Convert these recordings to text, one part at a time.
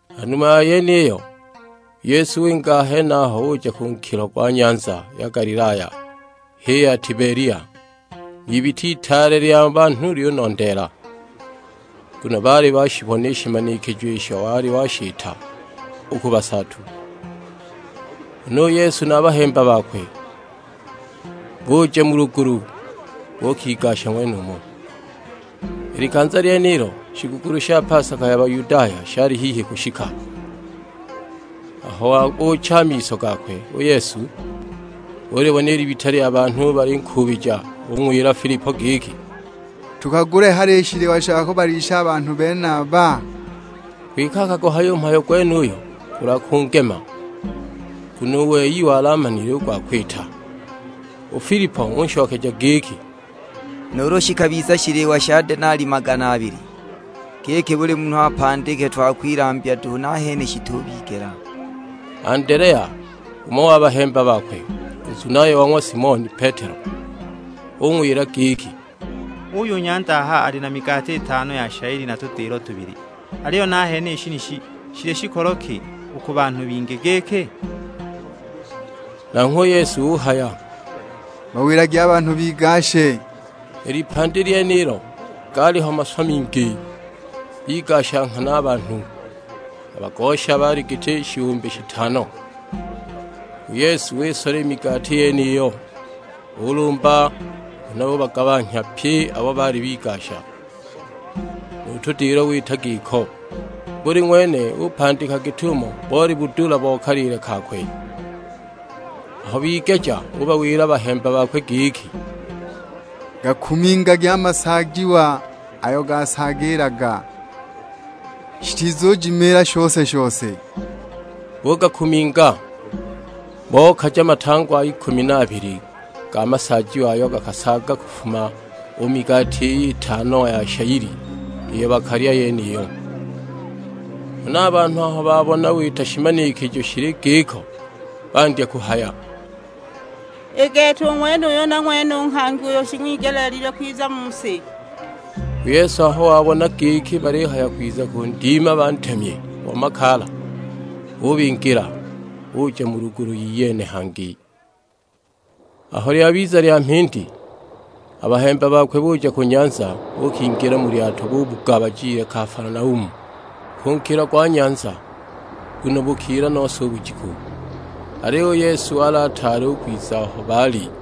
Ha numa ya yeniyo, u Yesu winga a henaho uja ku nkilo gwa nyanza ya Galilaya (h'i ya Tibelia). N'ibita itaale lya banhu lyunondeela, nguno baali bashibona i shimanikijo isho wali washita u ku basaatu. Huna u Yesu na a bahemba bakwe buja mu lugulu, buukigasha ng'wenumo. I likanza lyenilo shigukulu sha pasaka ya Bayudaya shali hihi kushika. Aho wabuucha a miso gakwe u Yesu, ulibona i libita lya banhu balinkuubija; ung'wila Filipo giki, "Tukagule hali shiliwa sha kubalisha a banhu benaba?" Kwike akaguhaya u mhayo gwenuyo kulwa kungema, nguno u wei wali amanile u gwa kwita. U Filipo unshokeja giki, "Nuulu shikabiza shiliwa sha denali magana abili, giki buli munhu apandike twa kwilambya duhu, nahene shitubigela." Andelea, umo wa bahemba bakwe, u nzunaye wa ng'wa Simoni Petelo, ung'wila giki, "Uuyu nyanda aha ali na migati itano ya shayili na tudilo tubili. Aliyo nahene i shenishi shili shikolo ki, u ku banhu bingi giki?" Nanghwe u Yesu uhaya, "Bawilagi a banhu bigashe." I lipandi lyenilo gaaliho maswa mingi, bigasha nghana a banhu, a bagosha baali giti shihumbi shitano. U Yesu wisola i migati yeniyo, ulumba huna ubagabanhya pye abo baali bigasha; nu tudilo wita giko. Buli ng'wene upandika git'umo boli budula bo kaliile kakwe. Aho bigeja ubawila a bahemba bakwe giki, "Gakumingagi a masaajiwa ayo gasaagiilaga, shitizujimiila shose-shose." Bugakuminga, bokaja matangwa ikumi na abili ga masaajiwa ayo gakasaaga kufuma u mu migati iy'itano ya shayili iyo bakalya yeniyo. Huna a banhu aho babona wita shimanikijo shili giko, bandya kuhaya, "I gete u ng'wenuyu na ng'wene u nghangi uyo shing'wigelile kwiza mu si!" U Yesu aho wabona giki balihaya kwiza kundima bantemye bo makaala, ubingila; uja mu lugulu iyene hangi. Aho lyabiza lya mhindi, a bahemba bakwe buja ku nyanza, buukingila mu lyato bubuga bajile Kafalanaumu, ku nkilo gwa nyanza. Nguno bukila nose u bujiku, aliyo u Yesu wali ataali u kwiza aho baali.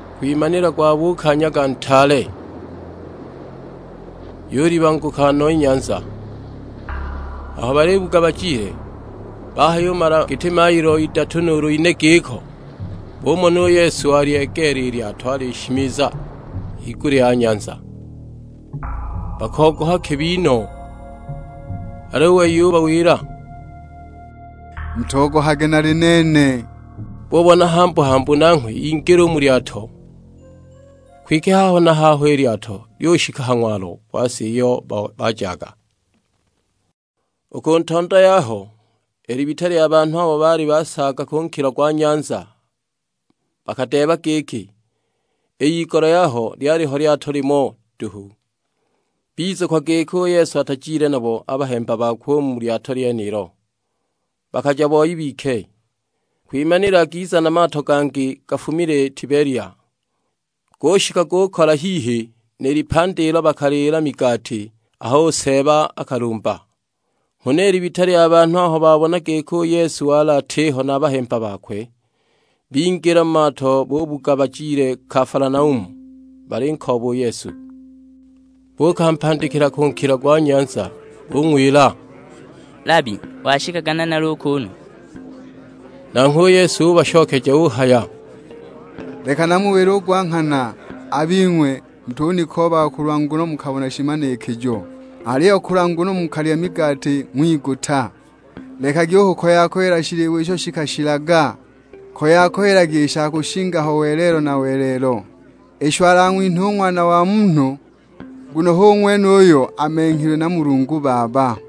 Kwimanila gwabuuka nyaga ntaale, yulibanguka no i nyanza. Aho balibuga bajile, bahayumala giti mailo idatu nuulu ine giko, bumona u Yesu walyegeela i lyato alishimiza higulya ya nyanza; bakogoha kibi no. Aliyo u wei ubawila, "Mutogohage nali nene." Bubona hambu-hambu nanghwe ingile u mu lyato, kwike haho na haho i lyato lyushika ha ng'walo gwa si iyo bajaga. U ku ntondo yaho i libita lya banhu abo baali basaaga ku nkilo gwa nyanza bakadeeba giki, i igolo yaho lyaliho lyato limo duhu. Bizukwa giki u Yesu atajile nabo a bahemba bakwe u mu lyato lyenilo, bakaja boi bike. Kwimanila giza na mato gangi gafumile Tibelia, gushika gukola hihi ni lipandi ilo bakaliila migati aho u Seeba akalumba. Huna i libita lya banhu aho babona giki u Yesu wali atiho na a bahemba bakwe, bingila mu mato bubuga bajile Kafalanaumu, balinkooba u Yesu. Buukampandikila ku nkilo gwa nyanza; bung'wila, "Labi, washikaga nanali u kuunu?" Nanghwe u Yesu ubashokeja uhaya, "Leki namuwile u gwa nghana, a bing'we mutunikoobaga kulwa nguno mukabona shimanikijo, aliyo kulwa nguno mukalya migati ng'wiguta. Lekagi u kukoya-koyela shiliwa isho shikashilaga, koya-koyelagi i sha kushinga ho welelo na welelo; isho alang'winhe u Ng'wana wa Munhu, nguno hu ng'wene uyo amenghilwe na Mulungu Baba."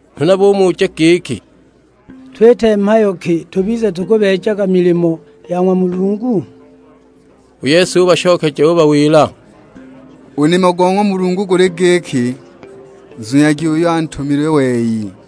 Huna bumuja giki, "Twite mhayo ki tubize tukubeejaga milimo ya ng'wa Mulungu?" U Yesu ubashokeja ubawila, "U nimo go ng'wa Mulungu guli giki, nzunyagi uyo antumile wei."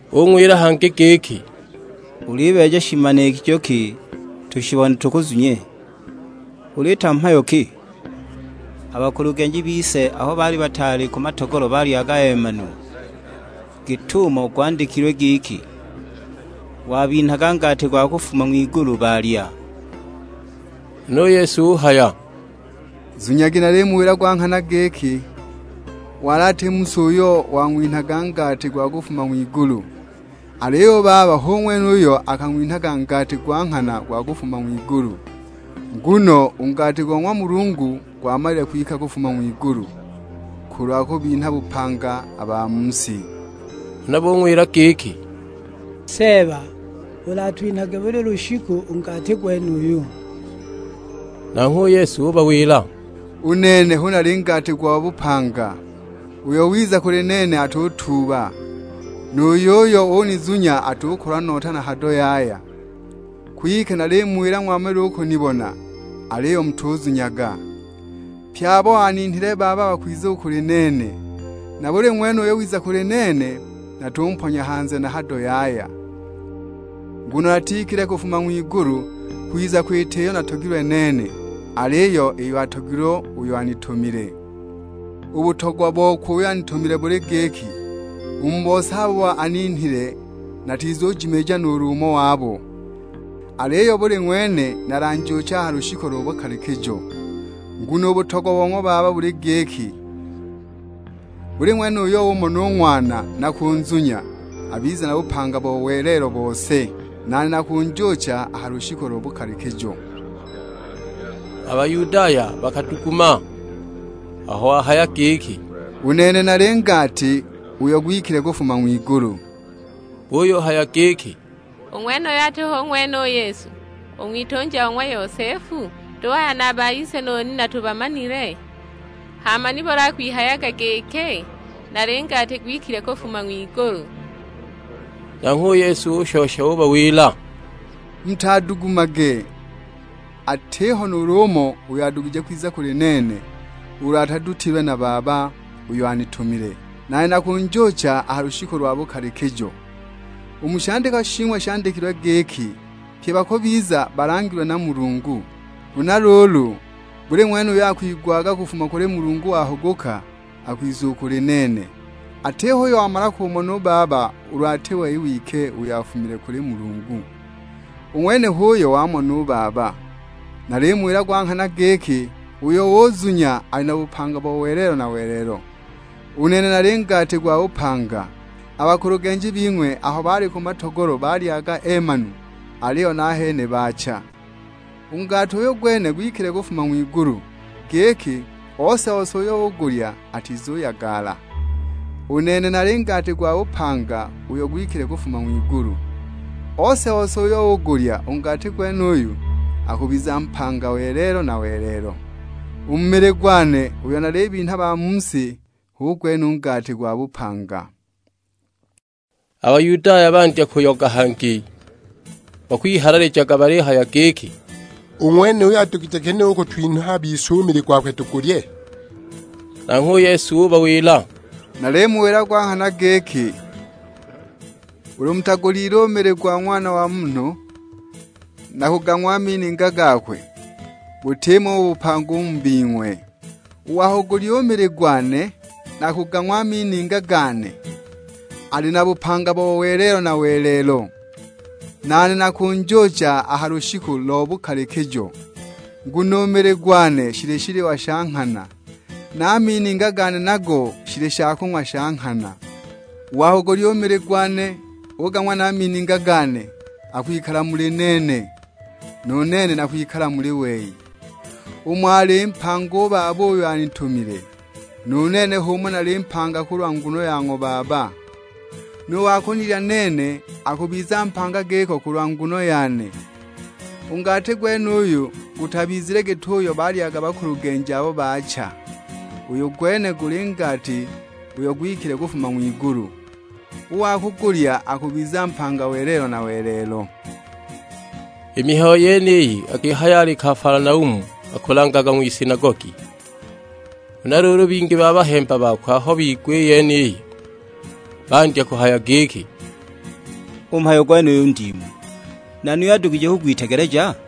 Bung'wila hangi giki, "Ulibeeja shimanikijo ki tushibone tukuzunye? Uliita mhayo ki? A bakulugenji bise aho bali ku matogolo balyaga eemanu, git'umo gwandikilwe giki, 'Wabinhaga ngati gwa kufuma ng'wigulu balya.' " Huna u Yesu uhaya, "Zunyagi nalimuwila gwa nghana giki, wali ati Musa uyo wang'winhaga ngati gwa kufuma ng'wigulu, aliyo u Baba hu ng'wene uyo akung'winhaga ngati gwa nghana gwa kufuma ng'wigulu. Nguno u ngati go ng'wa Mulungu gwamalile kwika kufuma u ng'wigulu, kulwa kubinha bupanga a ba mu si." Huna bung'wila giki, "Seeba, ulatwinhage buli lushiku u ngati gwenuyu." Nanghwe u Yesu ubawila, "U nene hu nali ngati gwa bupanga. Uyo wiza kuli nene atutuuba, nu yuyo unizunya atukolwa nota na hado yaya. Kwike nalimuwila ng'wamalile u kunibona, aliyo mutuzunyaga. Pye abo aninhile Baba bakwiza u kuli nene, na buli ng'wene uyo wiza kuli nene, natumponya hanze na hado yaya. Nguno natikile kufuma ng'wigulu kwiza kwita iyo natogilwe nene, aliyo iyo atogilwe uyo anitumile. U butogwa bokwe uyo anitumile buli giki, u mu bose abo aninhile natizunjimiija nuulu umo wabo, aliyo buli ng'wene nalanjuuche a ha lushiku lo bukalikijo. Nguno u butogwa bo ng'wa Baba buli giki, buli ng'wene uyo umona u Ng'wana na kunzunya, abize na bupanga bo welelo bose, nane nakunjuucha a ha lushiku lo bukalikijo." A Bayudaya bakaduguma aho wahaya giki, "U nene nali ngati uyo gwikile kufuma ng'wigulu." Buyuhaya giki, "U ng'wenuyu ati hu ng'wene u Yesu, u ng'witunja o ng'wa Yosefu? Duhaya na a ba ise nu nina tubamanile? Hama nibuli akwihayaga giki, 'Nali ngati gwikile kufuma ng'wigulu?' " Nanghwe u Yesu ushosha ubawila, "Mutadugumage, atiho nuulu umo uyo adugije kwiza kuli nene, ulu atadutilwe na Baba uyo anitumile; nane nakunjuucha a ha lushiku lwa bukalikijo. U mu shandikwa shing'we handikilwe giki, 'Pye bakubiza balangilwe na Mulungu.' Huna luulu, buli ng'wene uyo akwigwaga kufuma kuli Mulungu wahuguka, akwizaga u kuli nene. Atiho uyo wamala kumona u Baba ulu ati we wike uyo afumile kuli Mulungu; u ng'wene h'uyo wamona u Baba. Nalimuwila gwa nghana giki, uyo uzunya ali na bupanga bo welelo na welelo. U nene nali ngati gwa bupanga. A bakulugenji bing'we aho bali ku matogolo balyaga eemanu, aliyo nahene baacha. U ngati uyu gwene gwikile kufuma ng'wigulu, giki ose-ose uyo ugulya atizuyagala. U nene nali ngati gwa bupanga uyo gwikile kufuma ng'wigulu, ose-ose uyo ugulya u ngati gwenuyu, akubiza mpanga welelo na welelo. U mili gwane uyo nalibinha ba mu si hu gwene u ngati gwa bupanga." A Bayudaya bandya kuyoga hangi bakwihalalijaga balihaya giki, "U ng'wenuyu adugije ginehe u kutwinha a bise u mili gokwe tugulye?" Nanghwe u Yesu ubawila, "Nalimuwila gwa nghana giki, ulu mutagulyile u mili go ng'wana wa Munhu, na kugang'wa a mininga gakwe, butimo u bupanga u mu bing'we. U wa kugulya u mili gwane, na kugang'wa a mininga gane, ali na bupanga bo welelo na welelo, nane nakunjuucha a ha lushiku lo bukalikijo. Nguno u mili gwane shili shiliwa sha nghana, na a mininga gane nago shili shakung'wa sha nghana. U wa kugulya u mili gwane ugang'wa na a mininga gane, akwikala muli nene; nu nene nakwikala muli wei. Umo ali mpanga u Baba uyo anitumile, nu nene h'umo nali mpanga kulwa nguno ya ng'wa Baba. Nu wa kunilya nene, akubiza mpanga giko kulwa nguno yane. U ngati gwenuyu gutabizile git'uyo balyaga bakulugenji abo baacha, uyu gwene guli ngati uyo gwikile kufuma ng'wigulu; u wa kugulya akubiza mpanga welelo na welelo." I mihayo yeniyi akihaya ali Kafalanaumu akulangaga ng'wisinagogi. Huna luulu bingi ba bahemba bakwe aho bigwa i yeniyo bandya kuhaya giki, "U mhayo gwenuyu ndiimu, nani uyo adugije kugwitegeleja?"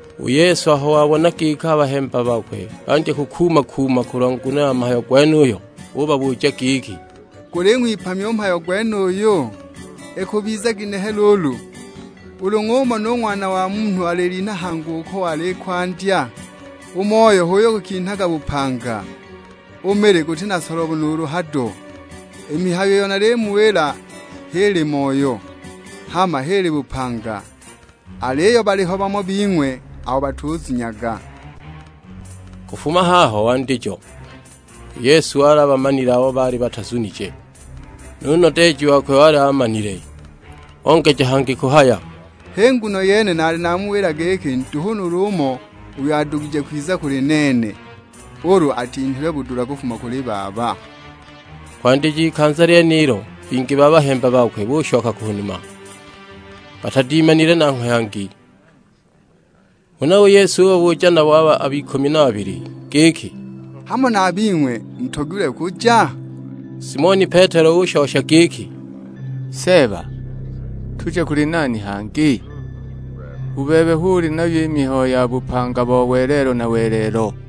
U Yesu aho wabona giki a bahemba bakwe bandya kukuuma-kuuma kulwa nguno ya mhayo gwenuyo ubabuja giki, "Guling'wipamya u mhayo gwenuyu? Ikubiza ginehe luulu ulu ng'umona u Ng'wana wa Munhu alilinha hangi uko wali i kwandya? U moyo h'uyo gukinhaga bupanga, u mili guti na solobo nuulu hado. I mihayo iyo nalimuwila h'ili moyo, hama h'ili bupanga. Aliyo baliho bamo bing'we abo batuzunyaga." Kufuma haho wandijo u Yesu wali abamanile abo baali batazunije, nu nodeeji wakwe wali aamanile. Ongeja hangi kuhaya, "Hi nguno yene naali namuwila giki nduhu nuulu umo uyo adugije kwiza kuli nene, ulu atinhilwe budula kufuma kuli Baba." Kwandija ikanza lyenilo bingi ba bahemba bakwe bushoka ku numa, batadimanile nanghwe hangi! Huna u Yesu ubabuja nabo abo ikumi na babili giki, "Hamo na a bing'we mutogilwe kuja?" Simoni Petelo ushosha giki, "Seeba, tuje kuli nani hangi? U bebe hu uli nayo i mihayo ya bupanga bo welelo na welelo!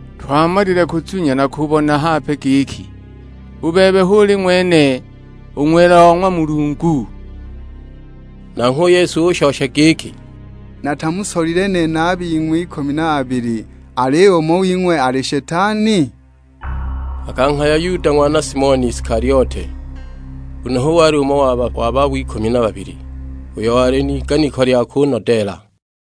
Twamalile kuzunya na kubona hape giki, u bebe hu uli ng'wene, u Ng'wela o ng'wa Mulungu." Nanghwe u Yesu unshokeja giki, "Natamusolile nene a bing'we ikumi na babili, aliyo umo wing'we ali Shetani?" Akanghaya Yuda ng'wana Simoni Isikaliote; nguno hu wali umo wa babo ikumi na babili, uyo wali n'iganiko lya kunodeela.